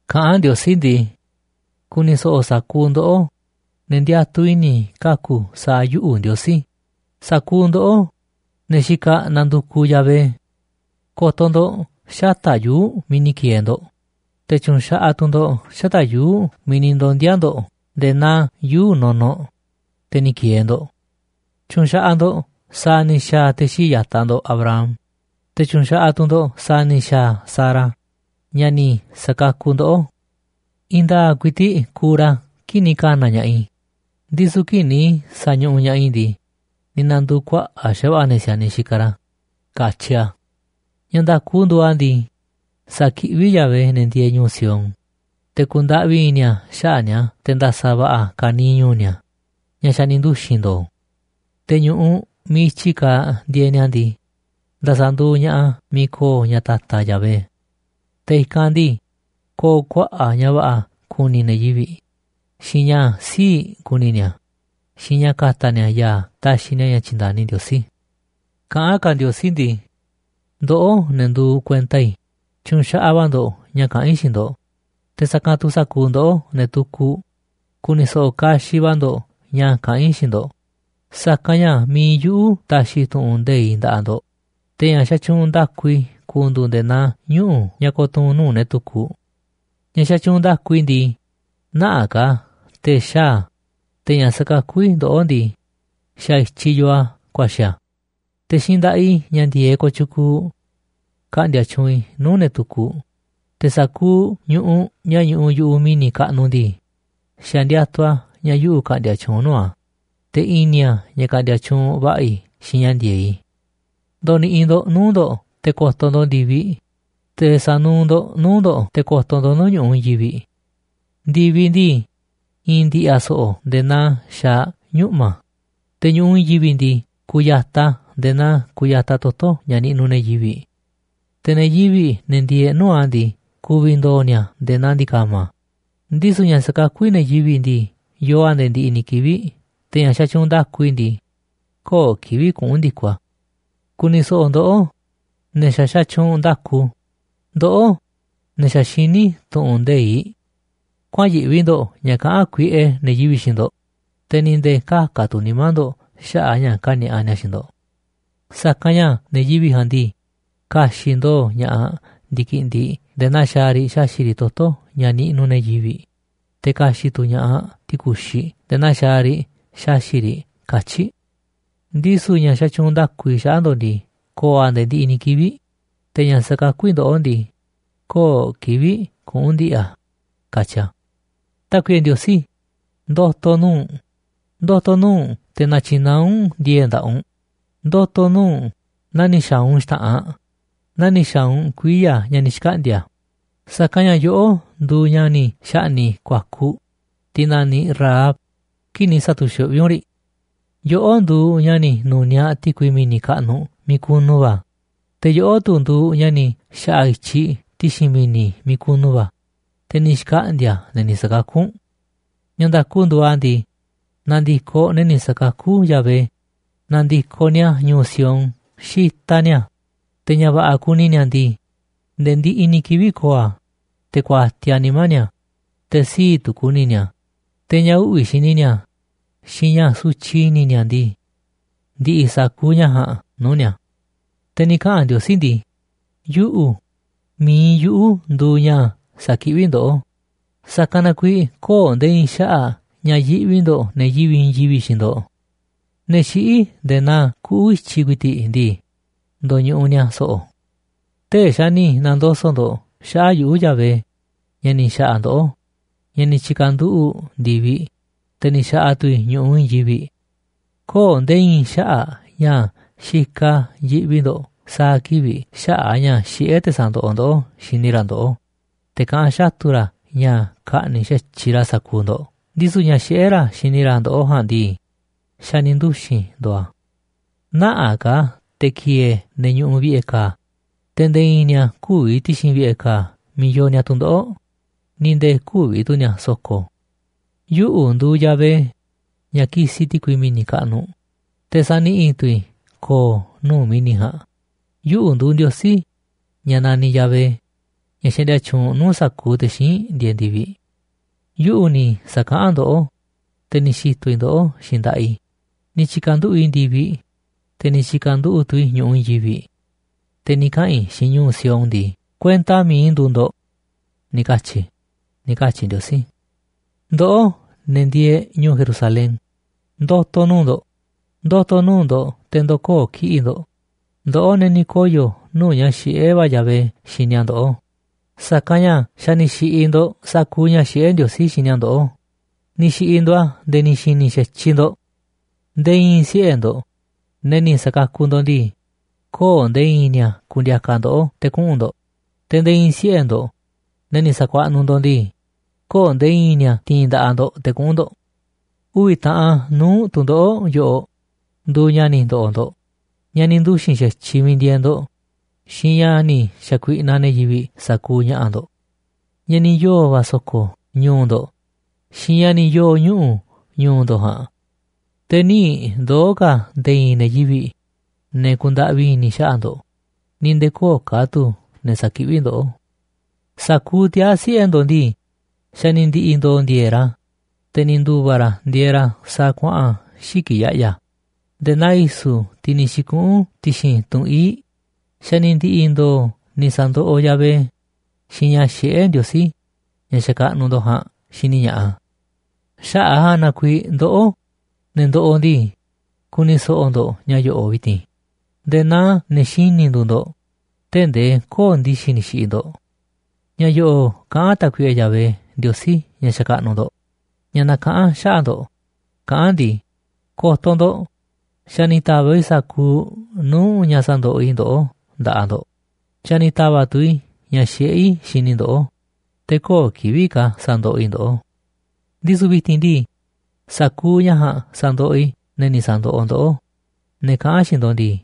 Kaꞌán Ndiosí ndii: “Ku̱ni̱ so̱ꞌo̱ sa̱kuuꞌ ndoꞌó, ne̱ ndiatuꞌ i̱ni̱ kaku̱ sa̱a̱ yuꞌu̱, Ndiosí, sa̱kuuꞌ ndoꞌó, ne̱ xikaꞌ nandukuꞌ Yahvé. Ko̱to̱ ndo̱ꞌ xata̱ꞌ yuu̱ꞌ miiꞌ ni̱ ki̱e̱e̱ ndo̱ꞌ, te̱ tyu̱nxaꞌaꞌ tu̱ ndo̱ꞌ xata̱ꞌ yuu̱ꞌ miiꞌ ni̱ ndondi̱a̱ ndo̱ꞌ nde̱e̱ naa yuu̱ꞌ nunuꞌ, te̱ ni̱ ki̱e̱e̱ ndo̱ꞌ. Tyu̱nxaꞌaꞌ ndo̱ꞌ sa̱a̱ ni̱ xa̱a̱ te̱ xii̱ꞌ ya̱taꞌ ndo̱ꞌ Abraham, te̱ tyu̱nxaꞌaꞌ tu̱ ndo̱ꞌ sa̱a̱ ni̱ xa̱a̱ Sara, ñaꞌ ni̱ sa̱kakuꞌ ndoꞌó. I̱i̱n nda̱a̱ꞌ ku̱i̱ti̱ꞌ kuuꞌ ra̱ kii̱ꞌ ni̱ ka̱na̱ ña̱ꞌaꞌ i̱, ndisu̱ kii̱ꞌ ni̱ sa̱ñuꞌuꞌ ña̱ꞌaꞌ i̱ ndii, ni̱ na̱ndu̱u̱ kuaꞌa̱ꞌ xa̱va̱ꞌa̱ ne̱ si̱a̱niꞌ xikaꞌ ra̱”, katyi a̱. Ña̱ nda̱ku nduuꞌ a̱ ndii, sa̱kiꞌví Yahvé ne̱ ndieeꞌ ñu̱u̱ Sión, te̱ ku̱ndaꞌvi i̱ni̱ a̱ xaꞌa̱ꞌ ni̱a̱ te̱ nda̱sa̱ va̱ꞌa̱ ka̱niiꞌ ñu̱u̱ ni̱a̱, ña̱ xa̱ ni̱ nduxi̱n ndo̱o̱. Te̱ ñu̱ꞌuꞌ miiꞌ i̱tyi kaaꞌ ndieeꞌ ni̱a̱ ndii, nda̱sa̱ nduuꞌ ña̱ꞌaꞌ a̱ miiꞌ ko̱o̱ ña̱ ta̱ta̱ Yahvé. Te̱ i̱kanꞌ ndii, ko̱o̱ kuaꞌa̱ꞌ ña̱ va̱ꞌa̱ kuni ne̱ yivi̱ꞌ, xiinꞌ ña̱ sii̱ꞌ kuni ni̱a̱, xiinꞌ ña̱ ka̱ta̱ ni̱a̱ ya̱a̱ taxiꞌ ni̱a̱ ña̱ tyi̱nda̱ni Ndiosí. Kaꞌán ka̱ Ndiosí ndii: “Ndoꞌó, ne̱ nduuꞌ kuenta i̱, tyu̱nxaꞌaꞌ va̱ ndo̱ꞌ ña̱ kaꞌán i̱ xiinꞌ ndo̱ꞌ. Te̱ sa̱kanꞌ tu̱ sa̱kuuꞌ ndoꞌó, ne̱ tukuꞌ, ku̱ni̱ so̱ꞌo̱ kaxiꞌ va̱ ndo̱ꞌ ña̱ kaꞌán i̱ xiinꞌ ndo̱ꞌ. Sa̱kanꞌ ña̱ mi̱iꞌ yuꞌu̱ ta̱xi̱ tu̱ꞌu̱n nde̱iꞌ nda̱ꞌaꞌ ndo̱ꞌ, te̱ ña̱ xatyuunꞌ nda̱ku i̱ ku̱ndu̱u̱ nde̱e̱ naa ñuꞌu̱ ña̱ ko̱tuu̱n nuu̱ꞌ ne̱ tukuꞌ. Ña̱ xatyuunꞌ nda̱ku i̱ ndii, nä̱ꞌaꞌ ka̱ te̱ xaa̱ a̱, te̱ ña̱ sa̱kakú i̱ ndoꞌó ndii, xa̱ i̱tyiꞌ yoo a̱ kuaxi̱ a̱. Te̱ xiinꞌ nda̱ꞌaꞌ i̱ ña̱ ndi̱e̱eꞌ kooꞌ tyukuuꞌ ka̱ꞌndi̱a̱ tyuunꞌ i̱ nuu̱ꞌ ne̱ tukuꞌ. Te̱ sa̱kuuꞌ ñu̱ꞌuꞌ ña̱ ñuꞌuꞌ yu̱ꞌuꞌ mi̱ni̱ kaꞌnuꞌ ndii, xa̱ ndiatuꞌ a̱ ña̱ yuꞌu̱ ka̱ꞌndi̱a̱ tyuunꞌ nuu̱ꞌ a̱, te̱ i̱ni̱ a̱ ña̱ ka̱ꞌndi̱a̱ tyuunꞌ va̱ꞌa̱ i̱ xiinꞌ ña̱ ndi̱e̱eꞌ i̱. Ndo̱ni̱ꞌi̱ ndo̱ꞌ nuu̱ꞌ ndo̱ꞌ te̱ ko̱to̱ ndo̱ꞌ ndi̱viꞌ, te̱ sa̱nuuꞌ ndo̱ꞌ nuu̱ꞌ ndo̱ꞌ te̱ ko̱to̱ ndo̱ꞌ nuu̱ꞌ ñu̱ꞌuꞌ i̱i̱n yivi̱ꞌ. Ndi̱viꞌ ndii, i̱i̱n ndi̱ꞌi̱ a̱ so̱ꞌo̱ nde̱e̱ naa xaaꞌ ñuꞌma̱, te̱ ñu̱ꞌuꞌ i̱i̱n yivi̱ꞌ ndii, ku̱ya̱taꞌ a̱ nde̱e̱ naa kuyataꞌ toto̱ ña̱ niꞌnuꞌ ne̱ yivi̱ꞌ. Te̱ ne̱ yivi̱ꞌ, ne̱ ndieeꞌ nuu̱ꞌ a̱ ndii, ku̱vi̱ ndo̱o̱ ni̱a̱ nde̱e̱ naa ndi̱ka̱ma̱. Ndisu̱ ña̱ sakakú i̱ ne̱ yivi̱ꞌ ndii, yoo a̱ nde̱e̱ ndiꞌiꞌ ni̱ kivi̱ꞌ, te̱ ña̱ xatyuunꞌ nda̱ku i̱ ndii, köo̱ꞌ kivi̱ꞌ kuꞌu̱n ndi̱koꞌ a̱. ’Ku̱ni̱ so̱ꞌo̱ ndoꞌó, ne̱ xa̱ xatyuunꞌ nda̱ku, ndoꞌó, ne̱ xa̱ xiní tu̱ꞌu̱n nde̱iꞌ. Kuäa̱n yiꞌvi ndo̱ꞌ ña̱ kaꞌán kuiꞌe ne̱ yivi̱ꞌ xiinꞌ ndo̱ꞌ, te̱ ni̱ nde̱e̱ kä̱ka̱ tu̱ nimá ndo̱ꞌ xaꞌa̱ꞌ ña̱ ka̱ni̱a̱ꞌa ni̱a̱ xiinꞌ ndo̱ꞌ. Sa̱kanꞌ ña̱ ne̱ yivi̱ꞌ ja̱a̱nꞌ ndii, ka̱xi̱ꞌ ndo̱o̱ ña̱ꞌaꞌ ndi̱kiꞌndiꞌ nde̱e̱ naa xaaꞌ riꞌ xaxi̱ꞌ riꞌ toto̱ ña̱ niꞌnuꞌ ne̱ yivi̱ꞌ, te̱ ka̱xi̱ꞌ tu̱ ña̱ꞌaꞌ ti̱ku̱xiꞌ nde̱e̱ naa xaaꞌ riꞌ xaxi̱ꞌ riꞌ katyi̱ꞌ. Ndisu̱ ña̱ xatyuunꞌ nda̱ku i̱ xaꞌa̱ꞌ ndo̱ꞌ ndii, ko̱o̱ a̱ nde̱e̱ ndiꞌiꞌ ni̱ kivi̱ꞌ. Te̱ ña̱ sa̱kakú i̱ ndoꞌó ndii, köo̱ꞌ kivi̱ꞌ kuꞌu̱n ndi̱ꞌi̱ a̱”, katyi a̱. Tákuiꞌe Ndiosí, ndo̱to̱ nuu̱ꞌ u̱nꞌ. Ndo̱to̱ nuu̱ꞌ u̱nꞌ te̱ na̱tyi̱naá u̱nꞌ ndi̱e̱e̱ꞌ nda̱ꞌaꞌ u̱nꞌ. Ndo̱to̱ nuu̱ꞌ u̱nꞌ naa ni̱ xa̱a̱ u̱nꞌ xta̱ꞌanꞌ, naa ni̱ xa̱a̱ u̱nꞌ kuiya̱ ña̱ ni̱ xkaꞌndi̱a̱, sa̱kanꞌ ña̱ yoꞌó nduuꞌ ña̱ ni̱ xa̱ꞌni̱ꞌ ku̱a̱kuꞌ, tiꞌ naniꞌ Rahab, kii̱ꞌ ni̱ sa̱tu̱xuꞌví u̱nꞌ riꞌ. Yoꞌó nduuꞌ ña̱ ni̱ nu̱niaꞌ ti̱kui mi̱ni̱ kaꞌnuꞌ miiꞌ kunu va̱, te̱ yoꞌó tu̱ nduuꞌ ña̱ ni̱ xa̱ꞌa̱ i̱tyiꞌ ti̱xi̱n mi̱ni̱ miiꞌ kunu va̱, te̱ ni̱ xkaꞌndi̱a̱ ne̱ ni̱ sa̱kakú u̱nꞌ. Ña̱ nda̱ku nduuꞌ a̱ ndii, na̱ndi̱koꞌ ne̱ ni̱ sa̱kakú Yahvé. Na̱ndi̱koꞌ ni̱a̱ ñu̱u̱ Sión xitaꞌ ni̱a̱, te̱ ña̱ va̱ꞌa̱ kuni ni̱a̱ ndii, nde̱e̱ ndiꞌiꞌ ni̱ kivi̱ꞌ ko̱o̱ a̱, te̱ kuatiaꞌ nimá ni̱a̱, te̱ sii̱ꞌ tu̱ ku̱ni̱ ni̱a̱, te̱ ña̱ uꞌvi̱ xini ni̱a̱, xiinꞌ ña̱ sutyiꞌ i̱ni̱ ni̱a̱ ndii, ndi̱ꞌi̱ sa̱kuuꞌ ña̱ ja̱a̱nꞌ nuu̱ꞌ ni̱a̱. Te̱ ni̱ kaꞌa̱n Ndiosí ndii: “Yuꞌu̱, mi̱iꞌ yuꞌu̱ nduuꞌ ña̱ sakiꞌví ndoꞌó, sa̱kanꞌ na kuiiꞌ köo̱ꞌ nde̱e̱ i̱i̱n xaꞌa̱ꞌ ña̱ yiꞌvi ndo̱ꞌ ne̱ yivi̱ꞌ i̱i̱n yivi̱ꞌ xiinꞌ ndo̱ꞌ. Ne̱ xiꞌí nde̱e̱ naa kuꞌu̱ i̱tyiꞌ ku̱i̱ti̱ꞌ ndii, ndoñuꞌuꞌ ni̱a̱ so̱ꞌo̱. Tee̱ꞌ xa̱ ni̱ na̱ndoso̱ꞌ ndo̱ꞌ xaꞌa̱ꞌ yuꞌu̱, Yahvé, ña̱ ni̱ xa̱ꞌa̱ ndoꞌó, ña̱ ni̱ tyi̱ka̱nduꞌu̱ꞌ ndi̱viꞌ, te̱ ni̱ xa̱ꞌa̱ tu̱ i̱ ñu̱ꞌuꞌ i̱i̱n yivi̱ꞌ. Köo̱ꞌ nde̱e̱ i̱i̱n xaꞌa̱ꞌ ña̱ xikaꞌ yiꞌvi ndo̱ꞌ sa̱a̱ kivi̱ꞌ xaꞌa̱ꞌ a̱ ña̱ xiꞌé te̱ sa̱ndoꞌoꞌ ndoꞌó xini ra̱ ndoꞌó, te̱ kaꞌán xatu̱ ra̱ ña̱ ka̱ꞌni̱ꞌ xa̱tyiꞌ ra̱ sa̱kuuꞌ ndo̱ꞌ. Ndisu̱ ña̱ xiꞌé ra̱ xini ra̱ ndoꞌó ja̱a̱nꞌ ndii, xa̱ ni̱ nduxi̱n ndo̱o̱ a̱. Nä̱ꞌaꞌ ka̱ te̱ ki̱e̱e̱ ne̱ ñuꞌuꞌ vi̱ꞌe̱ ka̱a̱, te̱ nde̱e̱ i̱i̱n ni̱a̱ kü̱vi̱ ti̱xi̱n vi̱ꞌe̱ ka̱a̱ miiꞌ yoo ni̱a̱ tu̱ndoꞌo̱ꞌ, ni̱ nde̱e̱ kü̱vi̱ tu̱ ni̱a̱ so̱ko̱. Yuꞌu̱ nduuꞌ Yahvé, ña̱ kisiꞌ ti̱kui mi̱ni̱ kaꞌnuꞌ, te̱ saniꞌi̱ tu̱ i̱ ko̱o̱ nuu̱ꞌ mi̱ni̱ ja̱a̱nꞌ. Yuꞌu̱ nduuꞌ Ndiosí, ña̱ naniꞌ Yahvé, ña̱ xaꞌndia tyuunꞌ nuu̱ꞌ sa̱kuuꞌ te̱ xíinꞌ ndieeꞌ ndi̱viꞌ. Yuꞌu̱ ni̱ sa̱kaꞌán ndoꞌó, te̱ ni̱ xi̱to̱ i̱ ndoꞌó xiinꞌ nda̱ꞌaꞌ i̱. Ni̱ tyi̱ka̱nduꞌu̱ꞌ i̱ ndi̱viꞌ, te̱ ni̱ tyi̱ka̱nduꞌu̱ꞌ tu̱ i̱ ñu̱ꞌuꞌ i̱i̱n yivi̱ꞌ. Te̱ ni̱ kaꞌa̱n i̱ xiinꞌ ñu̱u̱ Sión ndii: Kuenta mi̱iꞌ i̱ nduuꞌ ndo̱ꞌ, ni̱ katyi̱ i̱”, ni̱ katyi̱ Ndiosí. Ndoꞌó, ne̱ ndieeꞌ ñu̱u̱ Jerusalén, ndo̱to̱ nuu̱ꞌ ndo̱ꞌ. Ndo̱to̱ nuu̱ꞌ ndo̱ꞌ te̱ ndo̱koo̱ kiꞌi̱ꞌ ndo̱ꞌ, ndoꞌó ne̱ ni̱ koyo̱ nuu̱ꞌ ña̱ xiꞌé va̱ Yahvé xini a̱ ndoꞌó. Sa̱kanꞌ ña̱ xa̱ ni̱ xi̱ꞌi̱ ndo̱ꞌ sa̱kuuꞌ ña̱ xiꞌé Ndiosí xini a̱ ndoꞌó, ni̱ xi̱ꞌi̱ ndo̱ꞌ a̱ nde̱e̱ ni̱ xi̱ni̱ xa̱tyiꞌ ndo̱ꞌ. Nde̱e̱ i̱i̱n siꞌe̱ ndo̱ꞌ, ne̱ ni̱ sa̱kakuꞌ ndo̱ꞌ ndii, köo̱ꞌ nde̱e̱ i̱i̱n ni̱a̱ ku̱ndi̱a̱ka̱ ndoꞌó te̱ kuꞌu̱n ndo̱ꞌ. Te̱ nde̱e̱ i̱i̱n siꞌe̱ ndo̱ꞌ, ne̱ ni̱ sa̱kuaꞌnuꞌ ndo̱ꞌ ndii, köo̱ꞌ nde̱e̱ i̱i̱n ni̱a̱ ti̱i̱n nda̱ꞌaꞌ ndo̱ꞌ te̱ kuꞌu̱n ndo̱ꞌ. Uvi̱ taꞌan nuu̱ꞌ tu̱ndoꞌo̱ꞌ yoꞌoꞌ nduuꞌ ña̱ ni̱ ndo̱ꞌo̱ ndo̱ꞌ, ña̱ ni̱ nduxi̱n xa̱tyiꞌ miiꞌ ndieeꞌ ndo̱ꞌ, xiinꞌ ña̱ ni̱ xa̱kuiꞌnaꞌ ne̱ yivi̱ꞌ sa̱kuuꞌ ña̱ꞌa̱ ndo̱ꞌ. Ña̱ ni̱ yoo̱ va̱ so̱ko̱ ñu̱u̱ ndo̱ꞌ xiinꞌ ña̱ ni̱ yoo̱ ñuꞌu̱ ñu̱u̱ ndo̱ꞌ ja̱a̱nꞌ. Te̱ nï̱ ndoo̱ ka̱ nde̱e̱ i̱i̱n ne̱ yivi̱ꞌ, ne̱ ku̱ndaꞌvi i̱ni̱ xaꞌa̱ꞌ ndo̱ꞌ, ni̱ nde̱e̱ köo̱ꞌ ka̱ tu̱ ne̱ sa̱kiꞌví ndoꞌó. Sa̱kuuꞌ tiaa̱ siꞌe̱ ndo̱ꞌ ndii, xa̱ ni̱ ndi̱ꞌi̱ ndo̱o̱ ndi̱e̱e̱ꞌ ra̱, te̱ ni̱ ndu̱va̱ ra̱ ndieeꞌ ra̱ sa̱a̱ kuaꞌa̱n xiki̱ꞌ ya̱ꞌya̱, nde̱e̱ naa i̱su̱, tiꞌ ni̱ xi̱kuꞌu̱n ti̱xi̱n tunꞌ ii̱ꞌ, xa̱ ni̱ ndi̱ꞌi̱ ndo̱o̱ ni̱ sa̱ndoꞌoꞌ Yahvé, xiinꞌ ña̱ xiꞌé Ndiosí, ña̱ xakaꞌnuꞌ ndo̱ꞌ ja̱a̱nꞌ xiniꞌ ña̱ꞌaꞌ a̱. Xaꞌa̱ꞌ a̱ ja̱a̱nꞌ na kuiiꞌ ndoꞌó, ne̱ ndoꞌoꞌ ndii, ku̱ni̱ so̱ꞌo̱ ndo̱ꞌ ña̱ yo̱ꞌo̱ꞌ vi̱ti̱n nde̱e̱ naa ne̱ xini̱ nduuꞌ ndo̱ꞌ, tee̱ꞌ ndee köo̱ꞌ ndi̱xi̱ ni̱ xi̱ꞌi̱ ndo̱ꞌ. Ña̱ yo̱ꞌo̱ꞌ kaꞌán Tákuiꞌe Yahvé, Ndiosí ña̱ xakaꞌnuꞌ ndo̱ꞌ, ña̱ nakaꞌán xaꞌa̱ꞌ ndo̱ꞌ, kaꞌán a̱ ndii: “Ko̱to̱ ndo̱ꞌ, xa̱ ni̱ ta̱va̱ꞌ i̱ sa̱kuuꞌ nuu̱ꞌ ña̱ sandoꞌoꞌ i̱ ndoꞌó nda̱ꞌaꞌ ndo̱ꞌ. Xa̱ ni̱ ta̱va̱ꞌ tu̱ i̱ ña̱ xiꞌé i̱ xini i̱ ndoꞌó, te̱ köo̱ꞌ kivi̱ꞌ ka̱ sa̱ndoꞌoꞌ i̱ ndoꞌó. Ndisu̱ vi̱ti̱n ndii, sa̱kuuꞌ ña̱ ja̱a̱nꞌ sa̱ndoꞌoꞌ i̱ ne̱ ni̱ sa̱ndoꞌoꞌ ndoꞌó, ne̱ kaꞌán xiinꞌ ndo̱ꞌ ndii: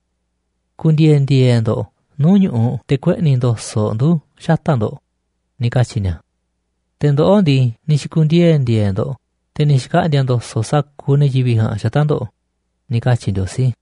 Ku̱ndi̱e̱e̱ ndi̱e̱e̱ ndo̱ꞌ nuu̱ꞌ ñu̱ꞌuꞌ te̱ kueꞌni̱ ndo̱so̱ꞌ ndu̱ xata̱ꞌ ndo̱ꞌ, ni̱ katyi̱ ni̱a̱. ’Te̱ ndoꞌó ndii, ni̱ xi̱ku̱ndiee̱ ndi̱e̱e̱ ndo̱ꞌ te̱ ni̱ xkaꞌndi̱a̱ ndo̱so̱ꞌ sa̱kuuꞌ ne̱ yivi̱ꞌ ja̱a̱nꞌ xata̱ꞌ ndo̱ꞌ”, ni̱ katyi̱ Ndiosí.